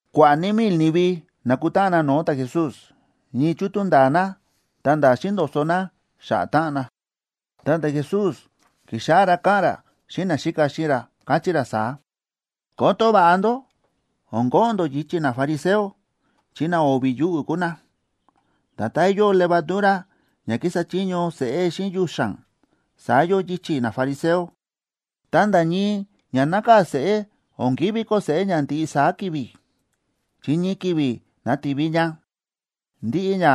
Kua̱ꞌa̱ ní mil ni̱vi na̱kutáꞌan na no̱o̱ ta̱Jesús, ñii chútú nda̱a̱ na ta̱nda̱ xíndo̱so̱ na xa̱ꞌa̱ táꞌan na. Ta ta̱Jesús ki̱xáꞌá ra káꞌa̱n ra xíꞌin naxíka xíꞌin ra, káchí ra saá: ―Koto va̱ꞌa ndó o̱n ko̱ꞌo̱n ndó yichi̱ nafariseo, chi na o̱vi̱ yuꞌu̱ kúu na. Nda̱tán yóo levadura ña kísa chiño seꞌé xíꞌin yuxa̱n, saá yóo yichi̱ nafariseo. Ta nda̱ ñii ña nákaa̱ seꞌé o̱n kívi koo seꞌé ña ndiꞌi saá ki̱vi̱, chi ñii ki̱vi̱ nativi ña. Ndiꞌi ña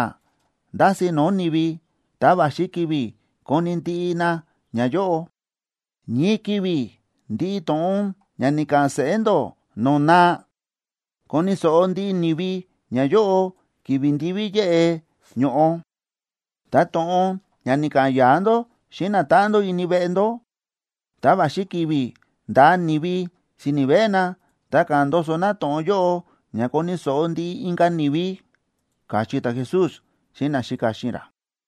ndási̱ no̱o̱ ni̱vi, ta va̱xi ki̱vi̱ koni̱ ndiꞌi na ñayóꞌo. Ñii ki̱vi̱ ndiꞌi to̱ꞌon ña ni̱ka̱ꞌa̱n seꞌé ndó no̱o̱ naa, koni̱ so̱ꞌo ndiꞌi ni̱vi ñayóꞌo ki̱vi̱ ndiví yéꞌe ño̱ꞌo. Ta to̱ꞌon ña ni̱ka̱ꞌa̱n ya̱a̱ ndó xíꞌin natáꞌan ndó ini veꞌe ndó, ta va̱xi ki̱vi̱ ndaa ni̱vi si̱ni̱ veꞌe na, ta ka̱ꞌa̱n ndoso na to̱ꞌon yóꞌo ña koni̱ so̱ꞌo ndiꞌi inka̱ ni̱vi ―káchí ta̱Jesús xíꞌin naxíka xíꞌin ra.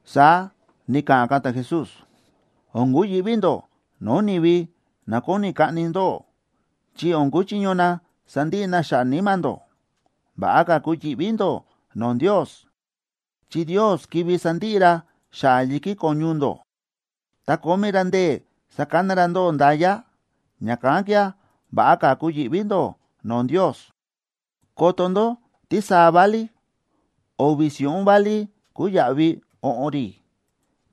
Saá ni̱ka̱ꞌa̱n ka̱ ta̱Jesús: ―O̱n kuyi̱ꞌví ndó no̱o̱ ni̱vi na kóni kaꞌni ndóꞌó, chi o̱n kuchiño na sandiꞌi na xa̱ꞌa̱ níma̱ ndó. Va̱ꞌa ka̱ kuyi̱ꞌví ndó no̱o̱ Ndios, chi Ndios kivi sandiꞌi ra xa̱ꞌa̱ yi̱kí ko̱ñu ndó, ta kómí ra ndee̱ sakana ra ndóꞌó nda̱ya. Ña̱kán kía̱, va̱ꞌa ka̱ kuyi̱ꞌví ndó no̱o̱ Ndios. ’Koto ndó tísaa válí: o̱vi̱ si̱ꞌún válí kúu yaꞌvi o̱ꞌo̱n rí.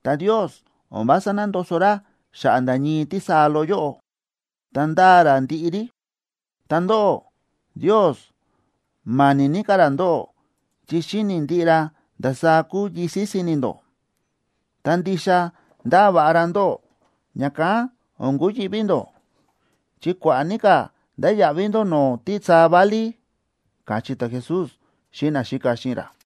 Ta Ndios o̱n vása nándoso ra xa̱ꞌa̱ nda̱ ñii tísaa loꞌo yóꞌo, ta ndáa ra ndiꞌi rí. Ta ndóꞌó, Ndios ma̱ni̱ ní ka̱ ra ndóꞌó, chi xíni̱ ndiꞌi ra ndasaá kúu yisi̱ si̱ni̱ ndó. Ta ndixa ndáa va̱ꞌa ra ndóꞌó, ña̱kán o̱n kuyi̱ꞌví ndó, chi kua̱ꞌa̱ ní ka̱ ndáya̱ꞌví ndó no̱o̱ tísaa válí ―káchí ta̱Jesús xíꞌin naxíka xíꞌin ra.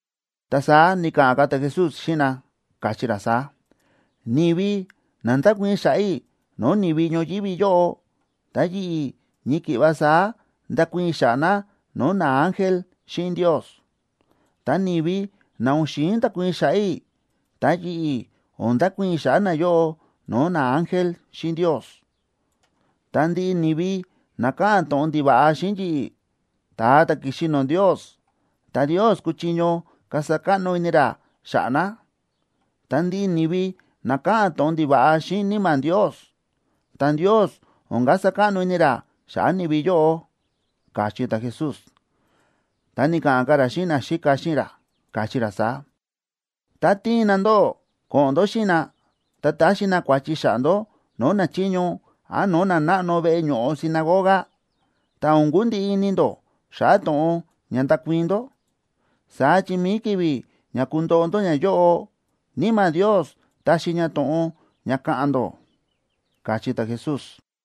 Ta saá ni̱ka̱ꞌa̱n ka̱ ta̱Jesús xíꞌin na, káchí ra saá: ―Ni̱vi na ndákuii̱n xa̱ꞌa̱ i̱ no̱o̱ ni̱vi ñoyívi yóꞌo, ta yi̱ꞌi̱, ñii ki̱ꞌva saá ndakuii̱n i̱ xa̱ꞌa̱ na no̱o̱ naángel xíꞌin Ndios. Ta ni̱vi na o̱n xi̱in ndakuii̱n xa̱ꞌa̱ i̱, ta yi̱ꞌi̱ o̱n ndakuii̱n i̱ xa̱ꞌa̱ nayóꞌo no̱o̱ naángel xíꞌin Ndios. ’Ta ndiꞌi ni̱vi na káꞌa̱n to̱ꞌon ndiva̱ꞌa xíꞌin yi̱ꞌi̱, ta̱a ta̱ ki̱xi no̱o̱ Ndios, ta Ndios kúchiño kasa káꞌno ini ra xa̱ꞌa̱ na. Ta ndiꞌi ni̱vi na káꞌa̱n to̱ꞌon ndiva̱ꞌa xíꞌin Níma̱ Ndios,a ta Ndios o̱n kasa káꞌno ini ra xa̱ꞌa̱ ni̱vi yóꞌo ―káchí ta̱Jesús. Ta ni̱ka̱ꞌa̱n ka̱ ra xíꞌin naxíka xíꞌin ra, káchí ra saá: ―Tá tiin na ndóꞌó ko̱ꞌo̱n ndó xíꞌin na, ta taxi na kua̱chi xa̱ꞌa̱ ndó no̱o̱ nachiño án no̱o̱ nanáꞌno veꞌe ño̱ꞌo sinagoga, ta o̱n kundiꞌi ini ndó xa̱ꞌa̱ to̱ꞌon ña ndakuii̱n ndó. Saá chi mi̱i ki̱vi̱ ña kundoꞌo ndó ñayóꞌo, Níma̱ Ndios taxi ña to̱ꞌon ña ka̱ꞌa̱n ndó ―káchí ta̱Jesús.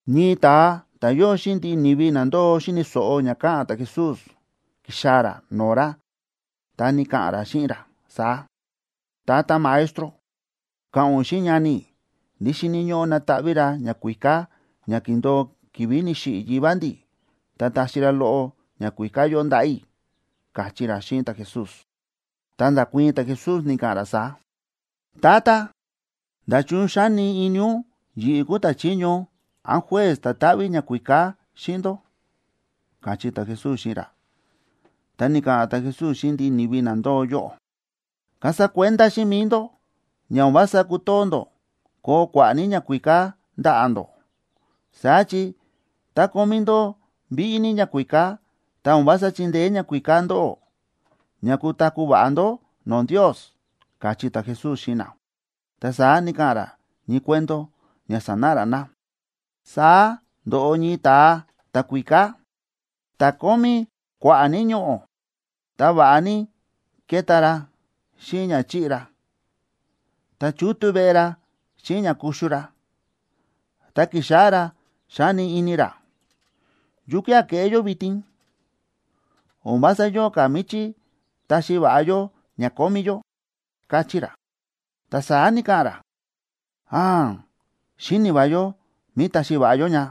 Ñii ta̱a ta̱ yóo xíꞌin ndiꞌi ni̱vi na ndóo xíni̱ so̱ꞌo ña káꞌa̱n ta̱Jesús, ki̱xaa̱ ra no̱o̱ ra ta ni̱ka̱ꞌa̱n ra xíꞌin ra saá: ―Tata Maestro, ka̱ꞌa̱n ún xíꞌin ñani i̱ ndí xíni̱ ñóꞌó nataꞌví ra ñakuíká ña ki̱ndo̱o ki̱vi̱ ni̱xiꞌi̱ yivá ndi̱, ta taxi ra loꞌo ñakuíká yóꞌo ndaꞌa̱ i̱ ―káchí ra xíꞌin ta̱Jesús. Ta nda̱kuii̱n ta̱Jesús, ni̱ka̱ꞌa̱n ra saá: ―Tata, ¿nda̱chun xáni ini ún yi̱ꞌi̱ kúu ta̱chiño án juez ta̱ táꞌví ñakuíká xíꞌin ndó? ―káchí ta̱Jesús xíꞌin ra. Ta ni̱ka̱ꞌa̱n ta̱Jesús xíꞌin ndiꞌi ni̱vi na ndóo yóꞌo: ―Kasa kuenda xíꞌin mi̱i ndó ña o̱n vása kútoo ndó koo kua̱ꞌa̱ ní ñakuíká ndaꞌa̱ ndó. Saá chi tá kómí ndó víꞌí ní ñakuíká, ta o̱n vása chíndeé ñakuíká ndóꞌó ña kutaku̱ va̱ꞌa ndó no̱o̱ Ndios ―káchí ta̱Jesús xíꞌin na. Ta saá ni̱ka̱ꞌa̱n ra ñii cuento ña sanáꞌa ra na: ―Saá ndo̱ꞌo ñii ta̱a ta̱kuíká, ta̱ kómí kua̱ꞌa̱ ní ñoꞌo̱. Ta va̱ꞌa ní ke̱ta ra xíꞌin ña chi̱ꞌi ra, ta chútú veꞌe ra xíꞌin ña kuxu ra. Ta ki̱xáꞌá ra xáni ini ra: “¿Yukía̱ keꞌé yó vitin? O̱n vása yóo ka̱ míchí taxi va̱ꞌa yó ña kómí yó”, káchí ra. Ta saá ni̱ka̱ꞌa̱n ra: “¡Áan! Xíni̱ va yó mí taxi va̱ꞌa yó ña.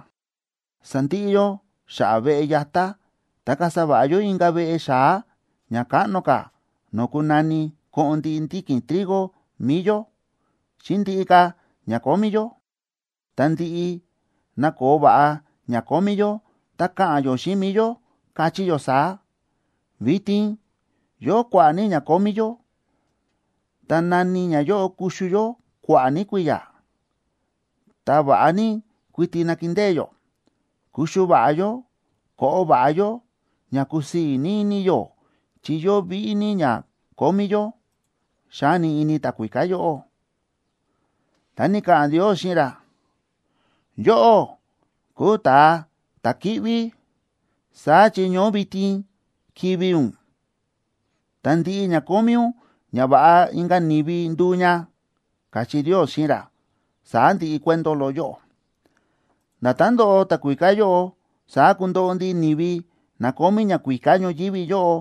Sandiꞌi yó xa̱ꞌa̱ veꞌe yatá, ta kasa va̱ꞌa yó inka̱ veꞌe xa̱á ña káꞌno ka̱ no̱o̱ kunani koꞌon ndiꞌi ndiki̱n trigo mi̱i yó, xíꞌin ndiꞌi ka̱ ña kómí yó. Ta ndi̱ꞌi na̱koo va̱ꞌa ña kómí yó, ta ka̱ꞌa̱n yó xíꞌin mi̱i yó, kachí yó saá: Vitin yóo kua̱ꞌa̱ ní ña kómí yó, ta náni ñayóꞌo kuxu yó kua̱ꞌa̱ ní kui̱ya̱. Ta va̱ꞌa ní kuiti nakindée yó, kuxu va̱ꞌa yó, koꞌo va̱ꞌa yó, ña kusii̱ ní ini yó chi yóo víꞌí ní ña kómí yó”, xáni ini ta̱kuíká yóꞌo. Ta ni̱ka̱ꞌa̱n Ndios xíꞌin ra: “¡Yóꞌó kúu ta̱a ta̱ kíꞌví!, saá chi ñoó vitin kivi̱ ún. Ta ndiꞌi ña kómí ún, ñava̱ꞌa inka̱ ni̱vi nduu ña”, káchí Ndios xíꞌin ra. Saá ndi̱ꞌi cuento loꞌo yóꞌo. Nda̱tán ndo̱ꞌo ta̱kuíká yóꞌo, saá kundoꞌo ndiꞌi ni̱vi na kómí ñakuíká ñoyívi yóꞌo,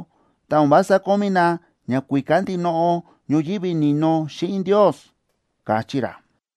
tá o̱n vása kómí na ñakuíká ndinoꞌo ñoyívi ni̱no xíꞌin Ndios ―káchí ra.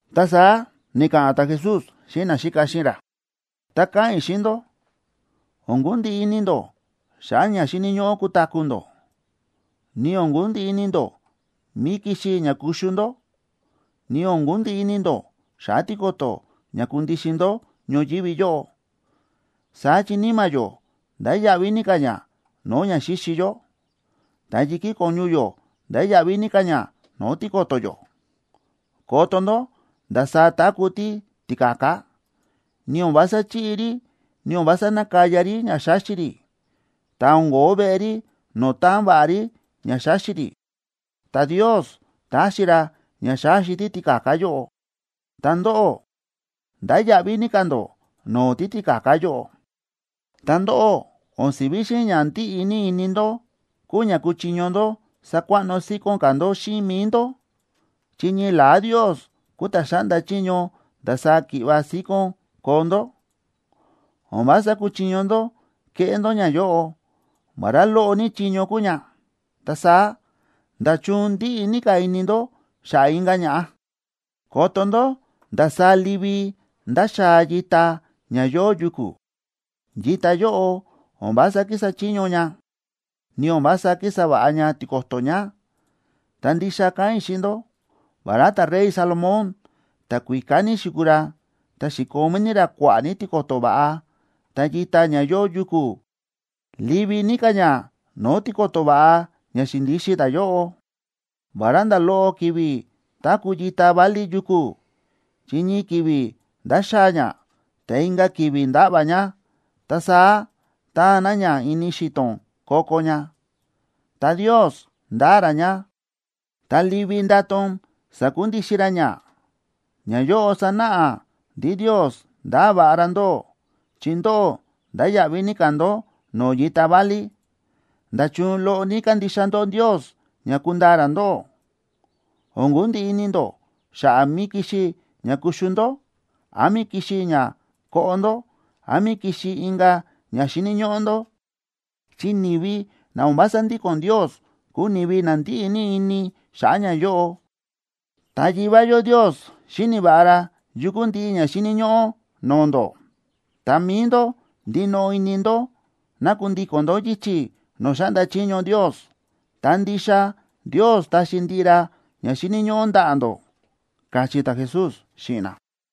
Ta saá ni̱ka̱ꞌa̱n ta̱Jesús xíꞌin naxíka xíꞌin ra: ―Ta káꞌa̱n i̱ xíꞌin ndó, o̱n kundiꞌi ini ndó xa̱ꞌa̱ ña xíni̱ ñóꞌó kutaku̱ ndó, ni o̱n kundiꞌi ini ndó mí kixi ña kuxu ndó, ni o̱n kundiꞌi ini ndó xa̱ꞌa̱ tiko̱to̱ ña kundixin ndó ñoyívi yóꞌo. Saá chi níma̱ yó ndáya̱ꞌví ní ka̱ ña no̱o̱ ña xíxi yó. Ta yi̱kí ko̱ñu yó ndáya̱ꞌví ní ka̱ ña no̱o̱ tiko̱to̱ yó. Koto ndó ndasaá táku̱ títika̱ka, ni o̱n vása chíꞌi rí, ni o̱n vása nákaya rí ña xáxi rí, ta o̱n ko̱ó veꞌe rí no̱o̱ táan va̱ꞌa rí ña xáxi rí. Ta Ndios táxi ra ña xáxi títika̱ka yóꞌo. Ta ndóꞌó, ndáya̱ꞌví ní ka̱ ndó no̱o̱ títika̱ka yóꞌo. Ta ndóꞌó, o̱n si̱ví xíꞌin ña ndíꞌi ní ini ndó kúu ña kúchiño ndó sakuaꞌno síkón ka̱ ndó xíꞌin mi̱i ndó, chi ñii la̱á Ndios kúu ta̱ xáꞌnda chiño ndasaá ki̱ꞌva síkón koo ndó. O̱n vása kúchiño ndó keꞌé ndó ñayóꞌo, vará loꞌo ní chiño kúu ña. Ta saá, ¿nda̱chun ndíꞌi ní ka̱ ini ndó xa̱ꞌa̱ inka̱ ña̱ꞌa? ’Koto ndó ndasaá livi ndáxaa yita ña yóo yuku̱; yita yóꞌo o̱n vása kísa chiño ña, ni o̱n vása kísa va̱ꞌa ña tiko̱to̱ ña. Ta ndixa káꞌa̱n i̱ xíꞌin ndó, vará ta̱rey Salomón, ta̱kuíká ní xi̱kuu ra, ta xi̱komí ní ra kua̱ꞌa̱ ní tiko̱to̱ va̱ꞌa, ta yita ña yóo yuku̱, livi ní ka̱ ña no̱o̱ tiko̱to̱ va̱ꞌa ña xi̱ndixin ta̱yóꞌo. Vará nda̱ loꞌo ki̱vi̱ táku̱ yita válí yuku̱, chi ñii ki̱vi̱ ndáxaa ña, ta inka̱ ki̱vi̱ ndáꞌva̱ ña, ta saá taan na ña ini xi̱to̱n ko̱ko̱ ña, ta Ndios ndáa ra ña, ta livi ndátón sákundixin ra ña. Ñayóꞌo sánáꞌa ndí Ndios ndáa va̱ꞌa ra ndóꞌó, chi ndóꞌó ndáya̱ꞌví ní ka̱ ndó no̱o̱ yita válí. ¡Nda̱chun loꞌo ní kándixa ndó Ndios ña kundaa ra ndóꞌó! O̱n kundiꞌi ini ndó xa̱ꞌa̱ mí kixi ña kuxu ndó, án mí kixi ña koꞌo ndó, án mí kixi inka̱ ña xíni̱ ñóꞌó ndó. Chi ni̱vi na o̱n vása ndíko̱n Ndios kúu ni̱vi na ndíꞌi ní ini xa̱ꞌa̱ ñayóꞌo. Ta Yivá yó Ndios xíni̱ va̱ꞌa ra yu kúu ndiꞌi ña xíni̱ ñóꞌó no̱o̱ ndó. Ta mi̱i ndó, ndinoꞌo ini ndó ná kundíko̱n ndó yichi̱ no̱o̱ xáꞌnda chiño Ndios, ta ndixa Ndios taxi ndiꞌi ra ña xíni̱ ñóꞌó ndaꞌa̱ ndó ―káchí ta̱Jesús xíꞌin na.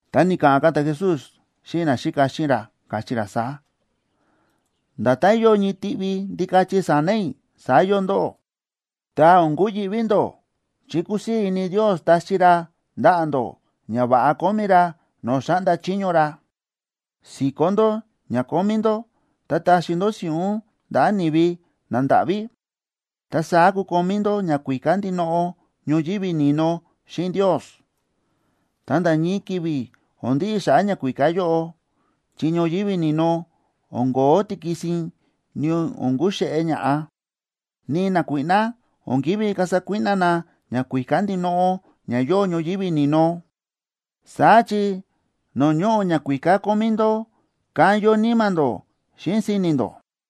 Ta ni̱ka̱ꞌa̱n ka̱ ta̱Jesús xíꞌin naxíka xíꞌin ra, káchí ra saá: ―Nda̱tán yóo ñii tiꞌvi ndikachi sa̱na̱ i̱, saá yóo ndóꞌó. Ta o̱n kuyi̱ꞌví ndó, chi kúsii̱ ini Ndios taxi ra ndaꞌa̱ ndó ñava̱ꞌa kómí ra no̱o̱ xáꞌnda chiño ra. Si̱kó ndó ña kómí ndó, ta taxi ndó si̱ꞌún ndaꞌa̱ ni̱vi nandáꞌví. Ta saá kukomí ndó ñakuíká ndinoꞌo ñoyívi ni̱no xíꞌin Ndios. Ta nda̱ ñii ki̱vi̱ o̱n ndiꞌi xa̱ꞌa̱ ñakuíká yóꞌo, chi ñoyívi ni̱no o̱n ko̱ó tikisin, ni o̱n kuxéꞌé ña̱ꞌa, ni nakuíꞌná o̱n ki̱ví kasa kuíꞌná na ñakuíká ndinoꞌo ña yóo ñoyívi ni̱no. Saá chi no̱o̱ ñóꞌo ñakuíká kómí ndó, kán yóo níma̱ ndó xíꞌin si̱ni̱ ndó.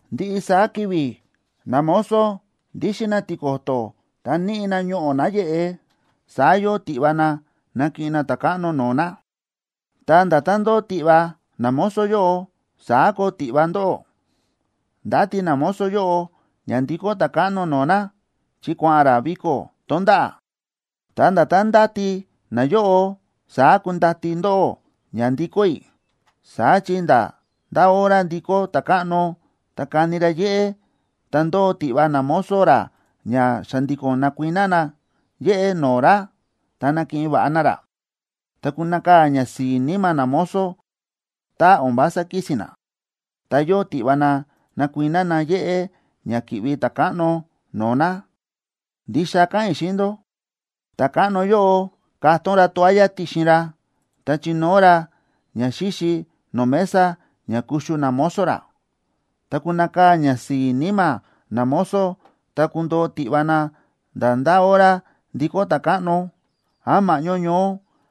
’Ndiꞌi saá ki̱vi̱ namozo ndíxin na tiko̱to̱ ta níꞌi na ñoꞌo̱ náyeꞌe, saá yóo tiꞌva na nakiꞌin na ta̱káꞌno no̱o̱ na. Ta nda̱tán ndóo tiꞌva namozo yóꞌo, saá koo tiꞌva ndóꞌó. Ndáti namozo yóꞌo ña ndikó ta̱káꞌno no̱o̱ na, chi kua̱ꞌa̱n ra viko̱ tonda̱ꞌa̱. Ta nda̱tán ndáti nayóꞌo saá kundati ndóꞌó ña ndikó i̱. Saá chi nda̱ ndá hora ndikó ta̱káꞌno ta kani ra yéꞌé, ta ndóo tiꞌva namozo ra ña xa̱ndi̱ko̱n nakuiná na yéꞌé no̱o̱ ra, ta nakiꞌin va̱ꞌa na ra. Ta kunakaa̱ ñasi̱i̱ níma̱ namozo tá o̱n vása kísi̱n na, ta yóo tiꞌva na nakuiná na yéꞌé ña ki̱ꞌvi ta̱káꞌno no̱o̱ na. Ndixa káꞌa̱n i̱ xíꞌin ndó, ta̱káꞌno yóꞌo katón ra toalla ti̱xin ra, ta chinóo ra ñaxíxi no̱o̱ mesa ña kuxu namozo ra. Ta kunakaa̱ ñasi̱i̱ níma̱ namozo tá kundoo tiꞌva na nda̱ ndá hora ndikó ta̱káꞌno, án ma̱ꞌñó ñoó,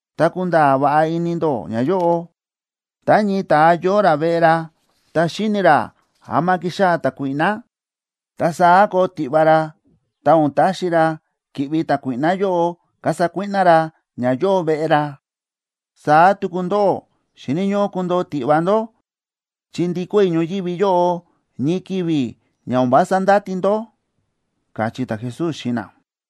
Ta kunda̱a̱ va̱ꞌa ini ndó ñayóꞌo: Tá ñii ta̱a yóo ra veꞌe ra, ta xíni̱ ra ama kixaa̱ ta̱kuíꞌná, ta saá koo tiꞌva ra ta o̱n taxi ra ki̱ꞌvi ta̱kuíꞌná yóꞌo kasa kuíꞌná ra ña yóo veꞌe ra. Saá tuku ndóꞌó, xíni̱ ñóꞌó kundoo tiꞌva ndó, chi ndikó i̱ ñoyívi yóꞌo ñii ki̱vi̱ ña o̱n vása ndáti ndó ―káchí ta̱Jesús xíꞌin na.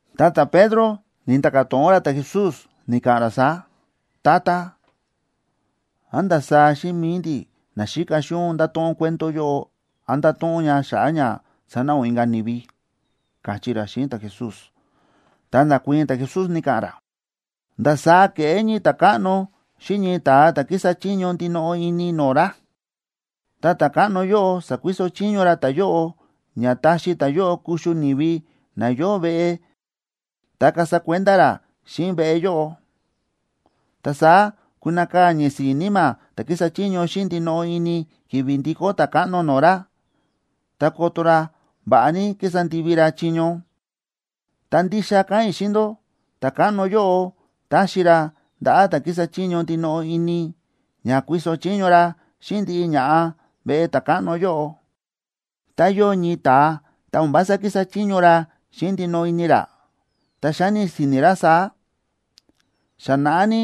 Ta ta̱Pedro ni̱nda̱ka̱ to̱ꞌon ra ta̱Jesús, ni̱ka̱ꞌa̱n ra saá: ―Tata, ¿án ndasaá xíꞌin mi̱i ndi̱ naxíka xíꞌin ún nda̱to̱ꞌon cuento yóꞌo, án nda̱to̱ꞌon ún ña xa̱ꞌa̱ ña sanáꞌa ún inka̱ ni̱vi? ―káchí ra xíꞌin ta̱Jesús. Ta nda̱kuii̱n ta̱Jesús, ni̱ka̱ꞌa̱n ra: ―¿Ndasaá keꞌé ñii ta̱káꞌno xíꞌin ñii ta̱a ta̱ kísa chiño xíꞌin ndinoꞌo ini no̱o̱ ra? Ta ta̱káꞌno yóꞌo sakuiso chiño ra ta̱yóꞌo ña taxi ta̱yóꞌo kuxu ni̱vi na yóo veꞌe ta kasa kuenda ra xíꞌin veꞌe yóꞌo. Ta saá kunakaa̱ ñasi̱i̱ níma̱ ta̱ kísa chiño xíꞌin ndinoꞌo ini ki̱vi̱ ndikó ta̱káꞌno no̱o̱ ra, ta koto ra va̱ꞌa ní ki̱sa ndivi ra chiño. Ta ndixa káꞌa̱n i̱ xíꞌin ndó, ta̱káꞌno yóꞌo taxi ra ndaꞌa̱ ta̱ kísa chiño ndinoꞌo ini, ña kuiso chiño ra xíꞌin ndiꞌi ña̱ꞌa veꞌe ta̱káꞌno yóꞌo. Tá yóo ñii ta̱a ta o̱n vása kísa chiño ra xíꞌin ndinoꞌo ini ra, ta xáni si̱ni̱ ra saá: “Xa naꞌá ní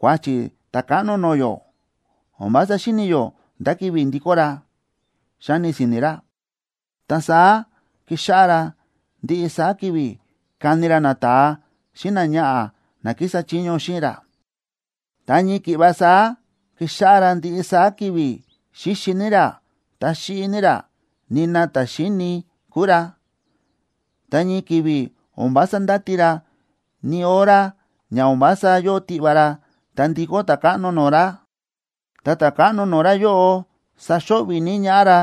kuáchi̱ ta̱káꞌno no̱o̱ yó, o̱n vása xíni̱ yó ndá ki̱vi̱ ndikó ra”, xáni si̱ni̱ ra. Ta saá kíxáꞌá ra ndiꞌi saá ki̱vi̱ káni ra nata̱a xíꞌin náñaꞌa̱ na kísa chiño xíꞌin ra, ta ñii ki̱ꞌva saá kíxáꞌá ra ndiꞌi saá ki̱vi̱ xíxi ní ra, ta xíꞌi ní ra, nina ta̱ xíini kúu ra. Ta ñii ki̱vi̱ o̱n vása ndáti ra, ni hora ña o̱n vása yóo tiꞌva ra, ta ndikó ta̱káꞌno no̱o̱ ra. Ta ta̱káꞌno no̱o̱ ra yóꞌo saxo̱ꞌvi̱ ní ñaꞌá ra,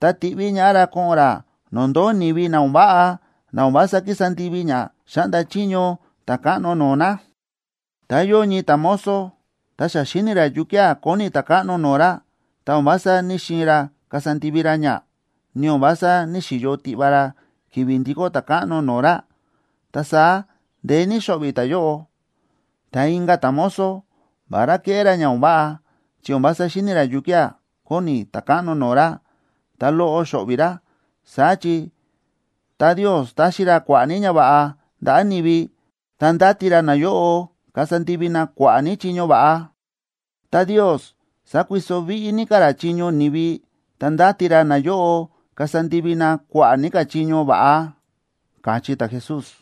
ta tiꞌví ñaꞌá ra ko̱ꞌo̱n ra no̱o̱ ndóo ni̱vi na o̱n váꞌa, na o̱n vása kísa ndivi ña xáꞌnda chiño ta̱káꞌno no̱o̱ na. ’Tá yóo ñii ta̱mozo, ta xa xíni̱ ra yukía̱ kóni ta̱káꞌno no̱o̱ ra, ta o̱n vása ní‑xiin ra kasa ndivi ra ña, ni o̱n vása ní‑xiyo tiꞌva ra ki̱vi̱ ndikó ta̱káꞌno no̱o̱ ra, ta saá ndeé ní xo̱ꞌvi̱ ta̱yóꞌo. Ta inka̱ ta̱mozo, vará kéꞌé ra ña o̱n váꞌa, chi o̱n vása xíni̱ ra yukía̱ kóni ta̱káꞌno no̱o̱ ra, ta loꞌo xo̱ꞌvi̱ ra. Saá chi tá Ndios táxi ra kua̱ꞌa̱ ní ñava̱ꞌa ndaꞌa̱ ni̱vi, ta ndáti ra nayóꞌo kasa ndivi na kua̱ꞌa̱ ní chiño va̱ꞌa. Tá Ndios sákuiso víꞌí ní ka̱ chiño ni̱vi, ta ndáti ra nayóꞌo kasa ndivi na kua̱ꞌa̱ ní ka̱ chiño va̱ꞌa ―káchí ta̱Jesús.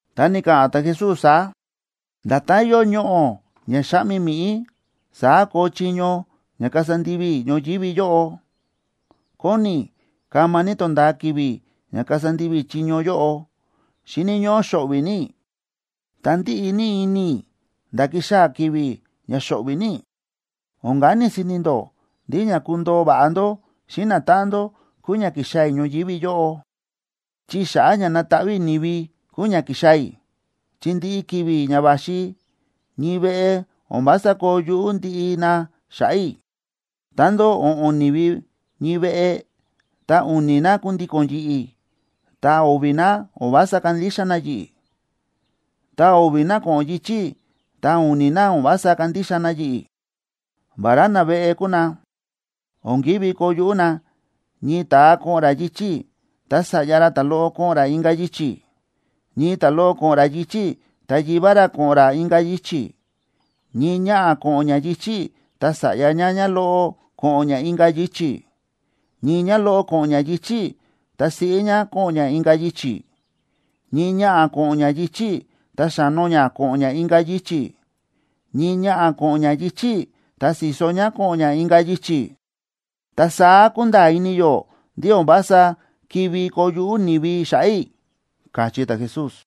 Ta ni̱ka̱ꞌa̱n ta̱Jesús saá: ―Nda̱tán yóo ñoꞌo̱ ña xáꞌmi mi̱ꞌí, saá koo chiño ña kasa ndivi i̱ ñoyívi yóꞌo. ¡Kóni i̱ kama ní tonda̱a ki̱vi̱ ña kasa ndivi i̱ chiño yóꞌo! Xíni̱ ñóꞌó xo̱ꞌvi̱ ní i̱, ta ndíꞌi ní ini i̱ nda̱ kixaa̱ ki̱vi̱ ña xo̱ꞌvi̱ ní i̱. O̱n kani si̱ni̱ ndó ndí ña kundoo va̱ꞌa ndó xíꞌin natáꞌan ndó, kúu ña ki̱xaa̱ i̱ ñoyívi yóꞌo, chi xa̱ꞌa̱ ña nataꞌví i̱ ni̱vi kúu ña ki̱xaa̱ i̱. Chi ndiꞌi ki̱vi̱ ña va̱xi ñii veꞌe o̱n vása koo yuꞌú ndiꞌi na xa̱ꞌa̱ i̱. Tá ndóo o̱ꞌo̱n ni̱vi ñii veꞌe, ta u̱ni̱ na kundíko̱n yi̱ꞌi̱, ta o̱vi̱ na o̱n vása kándixa na yi̱ꞌi̱. Tá o̱vi̱ na ko̱ꞌo̱n yichi̱ i̱, ta u̱ni̱ na o̱n vása kándixa na yi̱ꞌi̱. Vará naveꞌe kúu na, o̱n kívi koo yuꞌú na: ñii ta̱a ko̱ꞌo̱n ra yichi̱ i̱, ta sa̱ꞌya ra ta̱loꞌo ko̱ꞌo̱n ra inka̱ yichi̱; ñii ta̱loꞌo ko̱ꞌo̱n ra yichi̱ i̱, ta yivá ra ko̱ꞌo̱n ra inka̱ yichi̱; ñii ñaꞌa̱ ko̱ꞌo̱n ñá yichi̱ i̱, ta sa̱ꞌya ñá ñáloꞌo ko̱ꞌo̱n ñá inka̱ yichi̱; ñii ñáloꞌo ko̱ꞌo̱n ñá yichi̱ i̱, ta siꞌí ñá ko̱ꞌo̱n ñá inka̱ yichi̱; ñii ñaꞌa̱ ko̱ꞌo̱n ñá yichi̱ i̱, ta xa̱no ñá ko̱ꞌo̱n inka̱ yichi̱; ñii ñaꞌa̱ ko̱ꞌo̱n ñá yichi̱ i̱, ta si̱so ñá ko̱ꞌo̱n inka̱ yichi̱. Ta saá kunda̱a̱ ini yó ndí o̱n vása ki̱ví koo yuꞌú ni̱vi xa̱ꞌa̱ i̱ ―káchí ta̱Jesús.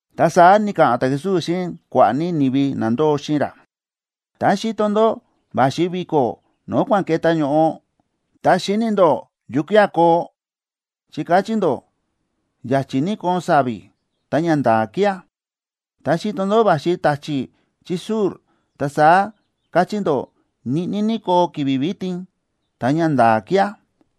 Ta saá ni̱ka̱ꞌa̱n ta̱Jesús xíꞌin kua̱ꞌa̱ ní ni̱vi na ndóo xíꞌin ra: ―Tá xíto ndó va̱xi vi̱ko̱ no̱o̱ kua̱n ke̱tá ño̱ꞌo, ta xíni̱ ndó yukía̱ koo, chi kachí ndó ya̱chi̱ ní koon sa̱vi̱, ta ñanda̱a̱ kía̱. Tá xíto ndó va̱xi ta̱chi̱ chí sur, ta saá kachí ndó ñiꞌní ní koo ki̱vi̱ vitin, ta ñanda̱a̱ kía̱.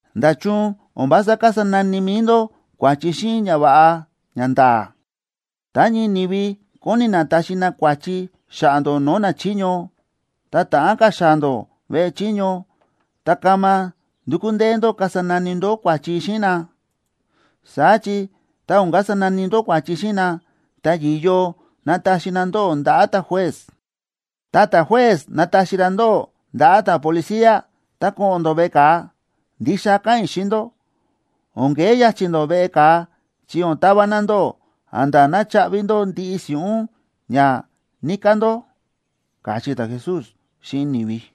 ―¿Nda̱chun o̱n vása kasa nani mi̱i ndó kua̱chi xíꞌin ñava̱ꞌa ñanda̱a̱? Tá ñii ni̱vi kóni na taxi na kua̱chi xa̱ꞌa̱ ndó no̱o̱ nachiño, tá ta̱ꞌán ka̱ xaa̱ ndó veꞌe chiño, ta kama ndukú ndee ndó kasa nani ndó kua̱chi xíꞌin na. Saá chi tá o̱n kasa nani ndó kua̱chi xíꞌin na, ta yi̱yo nataxi na ndóꞌó ndaꞌa̱ ta̱juez. Ta ta̱juez nataxi ra ndóꞌó ndaꞌa̱ ta̱policía, ta ko̱ꞌo̱n ndó veꞌe ka̱a. Ndixa káꞌa̱n i̱ xíꞌin ndó, o̱n kee ya̱chi̱ ndó veꞌe ka̱a chi o̱n tava na ndóꞌó a̱nda̱ ná chaꞌvi ndó ndiꞌi si̱ꞌún ña níká ndó ―káchí ta̱Jesús xíꞌin ni̱vi.